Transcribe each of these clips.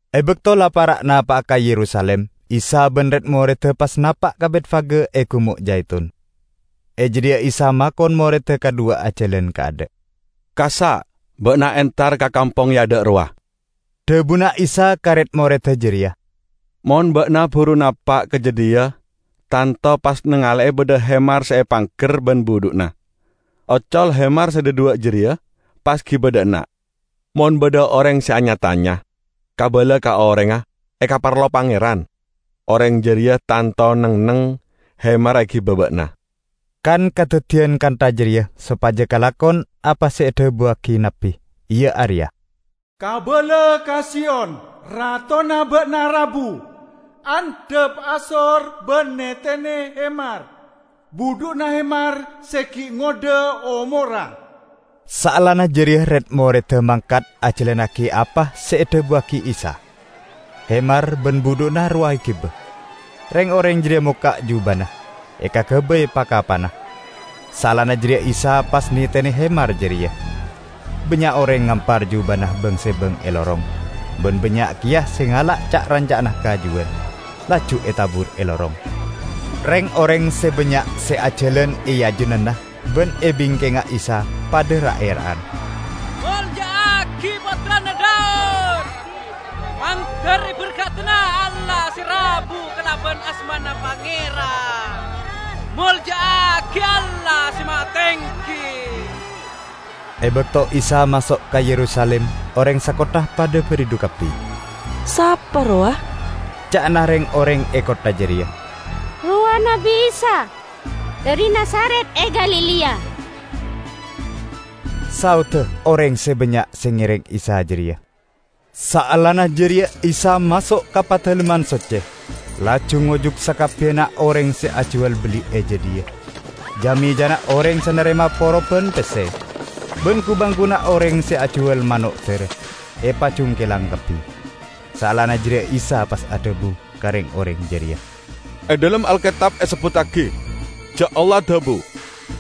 E bakto la para' napa'a ka Yerusalim, Isa ban red-moredda pas napa' ka Betfage e Gumo' Jaitun. E jadhiya Isa makon moredda kadhuwa ajalan kaadha'. "Kassa' ba'na entar ka kampong e adha' rowa," dhabuna Isa ka red-moredda jareya. "Mon ba'na buru napa' ka jadhiya tanto pas nangale'e badha hemar se epangger ban budhu'na. Ocol hemar se dhadhuwa' jareya, pas giba dha' enna'. Mon badha oreng se anya-tanya, kabala ka orengnga, 'Ekaparlo Pangeran', oreng jareya tanto neng-enneng hemarra egiba ba'na." Kan kadaddiyan kantha jareya sopaja kalakon apa se edhabuwagi nabbi, iya areya: "Kabala ka Siyon, Ratona ba'na rabu. Andhap asor ban netene hemar, budhu'na hemar se gi' ngodha omorra." Saellana jareya red-moredda mangkat ajalannagi apa se edhabuwagi Isa. Hemar ban budhu'na rowa egiba. Reng-oreng jareya mokka' jubana, ekagabay pa-kapana. Saellana jareya Isa pas netene hemar jareya. Bannya' oreng ngampar jubana bang-sebang e lorong, ban bannya' keya se ngala' ca'-ranca'na kajuwan, laju etabur e lorong. Reng-oreng se bannya' se ajalan e ajunanna ban e bingkengnga Isa padha ra'-era'an, "Molja'agi Pottrana Daud! Mandar eberkadana Allah se rabu kalaban asmana Pangeran! Molja'agi Allah Se Mahatenggi!" E bakto Isa maso' ka Yerusalim oreng sakottha padha baridhu kabbi. "Sapa rowa?" ca'na reng-oreng e kottha jareya. "Rowa Nabbi Isa, dhari Nazaret e Galilea," saodda oreng se bannya' se ngereng Isa jareya. Saellana jareya Isa maso' ka Padalemman Socce, laju ngojuk sakabbiyanna oreng se ajuwal belli e jadhiya. Ja-mejana oreng se narema poroban pesse ban ku-bangkuna oreng se ajuwal mano' dara epajungkelang kabbi. Saellana jareya Isa pas adhabu ka reng-oreng jareya, "E dhalem Alketab esebbuttagi ja' Allah adhabu,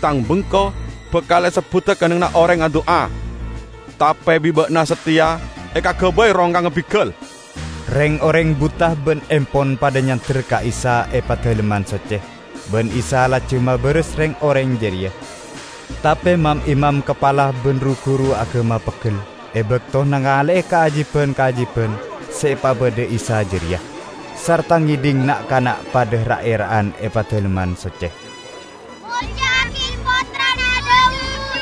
'Tang bengko bakal esebbuda kennengnganna oreng adu'a.' Tape bi' ba'na sateya ekagabay rongkangnga bigal!" Reng-oreng buta ban empon padha nyander ka Isa e Padalemman Socce, ban Isa laju mabaras reng-oreng jareya. Tape mam-imam kapala ban ru-guru agama peggel e bakto nangale'e kaajiban-kaajiban se epabadha Isa jareya, sarta ngedhing na'-kana' padha ra'-era'an e Padalemman Socce, "Molja'agi Pottrana Daud!"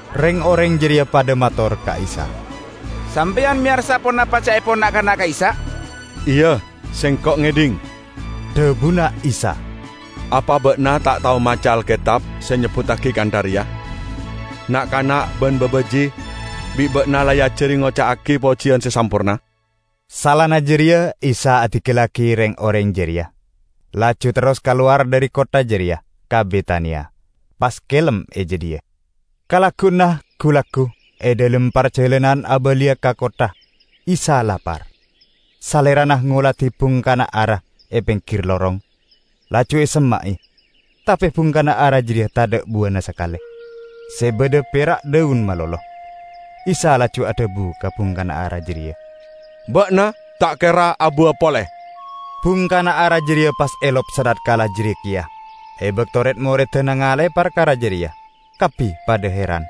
Reng-oreng jareya padha mator ka Isa, "Sampeyan meyarsa ponapa ca'epon na'-kana' ka'issa'?" "Iya, Sengko' ngedhing," dhabuna Isa. "Apa ba'na ta' tao maca Alketab se nyebbuttagi kantha reya, 'Na'-kana' ban babaji' bi' ba'na la eajari ngoca'agi pojiyan se samporna?' " Saellana jareya Isa adinggallagi reng-oreng jareya, laju terros kalowar dhari kottha jareya ka Betania, pas kelem e jadhiya. Kalagguwanna gu-laggu, e dhalem parjalanan abaliya ka kottha, Isa lapar. Salerana ngoladi bungkana ara e penggir lorong, laju esemma'e, tape bungkana ara jareya tadha' buwana sakale; se badha pera' dhaun malolo. Isa laju adhabu ka bungkana ara jareya, "Ba'na ta' kera abuwa pole." Bungkana ara jareya pas elop sanatkala jareya keya. E bakto red-moredda nangale'e parkara jareya, kabbi padha heran.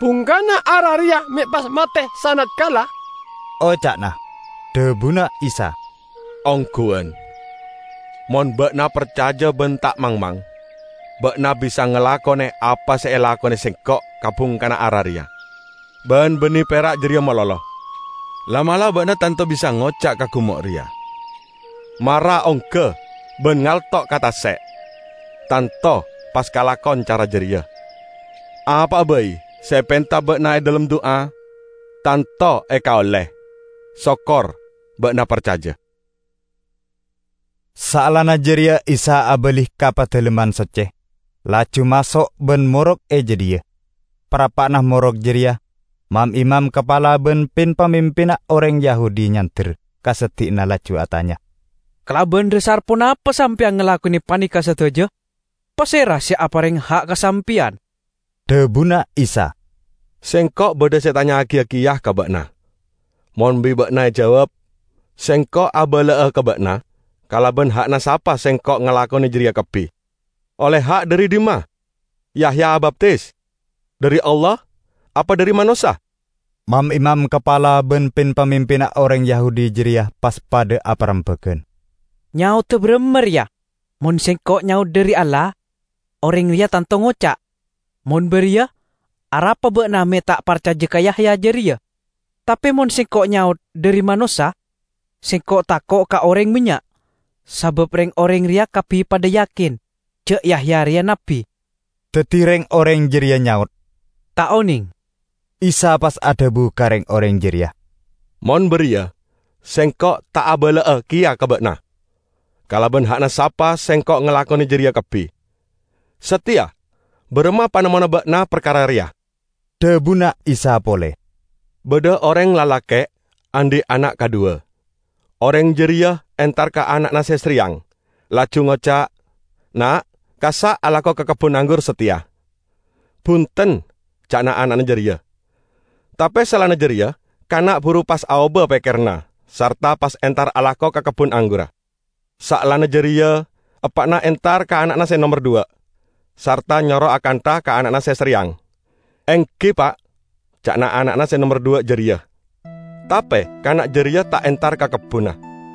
"Bungkana ara reya me' pas mate sanatkala?" oca'na. Dhabuna Isa, "Ongguwan, mon ba'na parcaja ban ta' mangmang, ba'na bisa ngalakone apa se la elakone Sengko' ka bungkana ara reya. Ban banne pera' jareya malolo, la'-mala' ba'na tanto bisa ngoca' ka gumo' reya, 'Mara ongga ban ngalto' ka tase'', tanto pas kalakon cara jareya. Apa'a bai se epenta ba'na e dhalem du'a, tanto ekaolle, sokor ba'na parcaja." Saellana jareya Isa abali ka Padalemman Socce, laju maso' ban morok e jadhiya. Parappa'na morok jareya, mam-imam kapala ban pin-pamimpinna oreng Yahudi nyander ka seddi'na laju atanya, "Kalaban dhasar ponapa sampeyan ngalakone paneka sadaja? Pasera se apareng ha' ka sampeyan?" Dhabuna Isa, "Sengko' badha se etanya'agiya keya ka ba'na. Mon bi' ba'na ejawab, Sengko' abala'a ka ba'na kalaban ha'na sapa Sengko' ngalakone jareya kabbi. Olle ha' dhari dhimma Yahya abaptis? Dhari Allah apa dhari manossa?" Mam-imam kapala ban pin-pamimpinna oreng Yahudi jareya pas padha aparembagan. "Nyaoda baramma reya? Mon sengko' nyaot 'Dhari Allah,' oreng reya tanto ngoca', 'Mon bariya, arapa ba'na me' ta' parcaja ka Yahya jareya?' Tape mon sengko' nyaot 'Dhari manossa,' sengko' tako' ka oreng bannya', sabab reng-oreng reya kabbi padha yakin ja' Yahya reya nabbi." Daddi reng-oreng jareya nyaot, "Ta' oneng." Isa pas adhabu ka reng-oreng jareya, "Mon bariya, Sengko' ta' abala'a keya ka ba'na kalaban ha'na sapa Sengko' ngalakone jareya kabbi." "Sateya baramma panemmona ba'na parkara reya?" dhabuna Isa pole. "Badha oreng lalake' andhi' ana' kadhuwa. Oreng jareya entar ka ana'na se sareyang, laju ngoca', 'Na', kassa' alako ka kebbun anggur sateya.' 'Bunten' ca'na ana'na jareya. Tape saellana jareya kana' buru pas aoba pekkeranna sarta pas entar alako ka kebbun anggurra. Saellana jareya eppa'na entar ka ana'na se nomer dhuwa', sarta nyoro akantha ka ana'na se sareyang. 'Enggi, Pa',' ca'na ana'na se nomer dhuwa' jareya. Tape kana' jareya ta' entar ka kebbunna.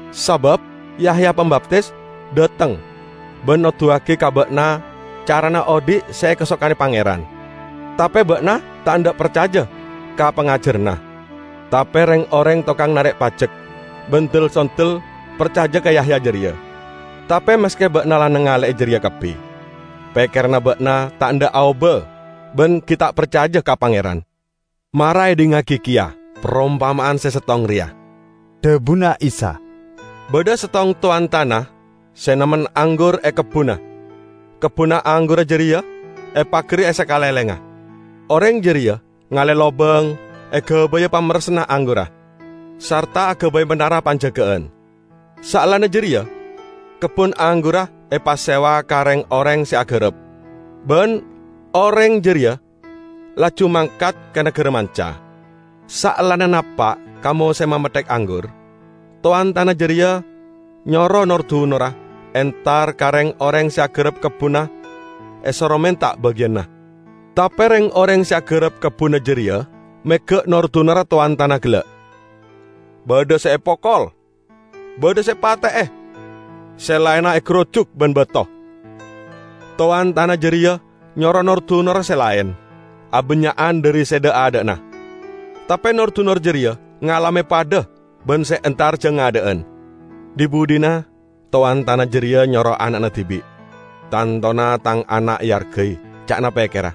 Sabab Yahya Pambaptis dhateng, ban noduwagi ka ba'na carana odhi' se ekasokane Pangeran, tape ba'na ta' endha' parcaja ka pangajaranna; tape reng-oreng tokang narek pajek ban del-sondel parcaja ka Yahya jareya. Tape maske ba'na la nangale'e jareya kabbi, pekkeranna ba'na ta' endha' aoba ban gi' ta' parcaja ka Pangeran." "Mara edhingngagi keya parompama'an se settong reya," dhabuna Isa. "Badha settong towan tana se namen anggur e kebbunna. Kebbunna anggurra jareya epagari e sakalenglengnga; oreng jareya ngale lobang egabaya pamerressanna anggurra, sarta agabay manara panjaga'an. Saellana jareya kebbun anggurra epasewa ka reng-oreng se agarap, ban oreng jareya laju mangkat ka nagara manca. Saellana napa' ka mosemma metthek anggur, towan tana jareya nyoro nor-dunorra entar ka reng-oreng se agarap kebbunna esoro menta bagiyanna. Tape reng-oreng se agarap kebbunna jareya mega' nor-dunorra towan tana gella', badha se epokol, badha se epate'e, se laenna egarujuk ban bato. Towan tana jareya nyoro nor-dunorra se laen, abannya'an dhari se dha'-adha'na. Tape nor-dunor jareya ngalame padha ban se entar jang adha'an. Dhi-budhina towan tana jareya nyoro ana'na dibi'. 'Tantona tang ana' eargai,' ca'na pekkerra.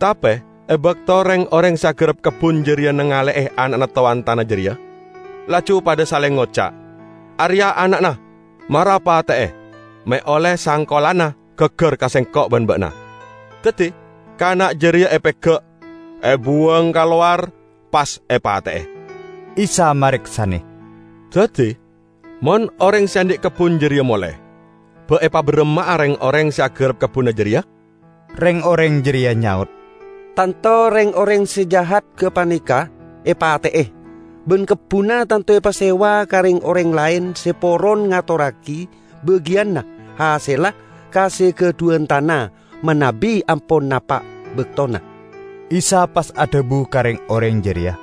Tape e bakto reng-oreng se agarap kebbun jareya nangale'e ana'na towan tana jareya, laju padha saleng ngoca', 'Areya' ana'na. Mara pate'e, me' olle sangkolanna gaggar ka sengko' ban ba'na!' Daddi kana' jareya epega', ebuwang ka lowar, pas epate'e." Isa mareksane, "Daddi, mon oreng se andhi' kebbun jareya mole, ba' epabaramma'a reng-oreng se agarap kebbunna jareya?" Reng-oreng jareya nyaot, "Tanto reng-oreng se jahat gapaneka epate'e, ban kebbunna tanto epasewa ka reng-oreng laen se poron ngatorragi bagiyanna hasella ka se gadhuwan tana manabi ampon napa' baktona." Isa pas adhabu ka reng-oreng jareya,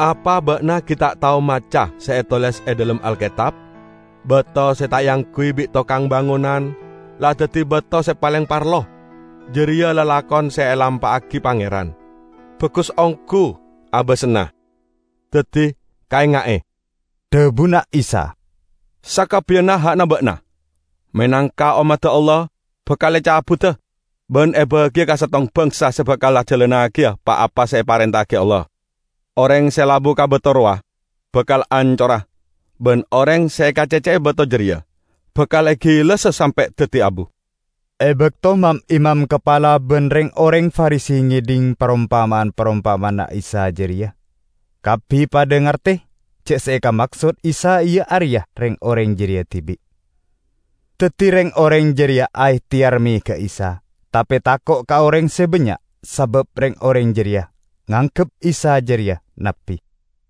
"Apa ba'na gi' ta' tao maca se etoles e dhalem Alketab? 'Bato se ta' eangguy bi' tokang bangonan la daddi bato se paleng parlo. Jareya lalakon se elampa'agi Pangeran; bagus onggu abasanna!' " "Daddi kaenga'e," dhabuna Isa, "sakabbiyanna ha'na ba'na menangka ommadda Allah bakal ecabuda ban ebagiya ka settong bangsa se bakal ajalannagiya pa-apa se eparenta'agi Allah. [ Oreng se labu ka bato rowa, bakal ancora; ban oreng se ekacecce'e bato jareya, bakal egilessa sampe' daddi abu.]" E bakto mam-imam kapala ban reng-oreng Farisi ngedhing parompama'an-parompama'anna Isa jareya, kabbi padha ngarte ja' se ekamaksod Isa iya areya reng-oreng jareya dibi'. Daddi reng-oreng jareya aehteyar mega'a Isa, tape tako' ka oreng se bannya', sabab reng-oreng jareya nganggep Isa jareya nabbi.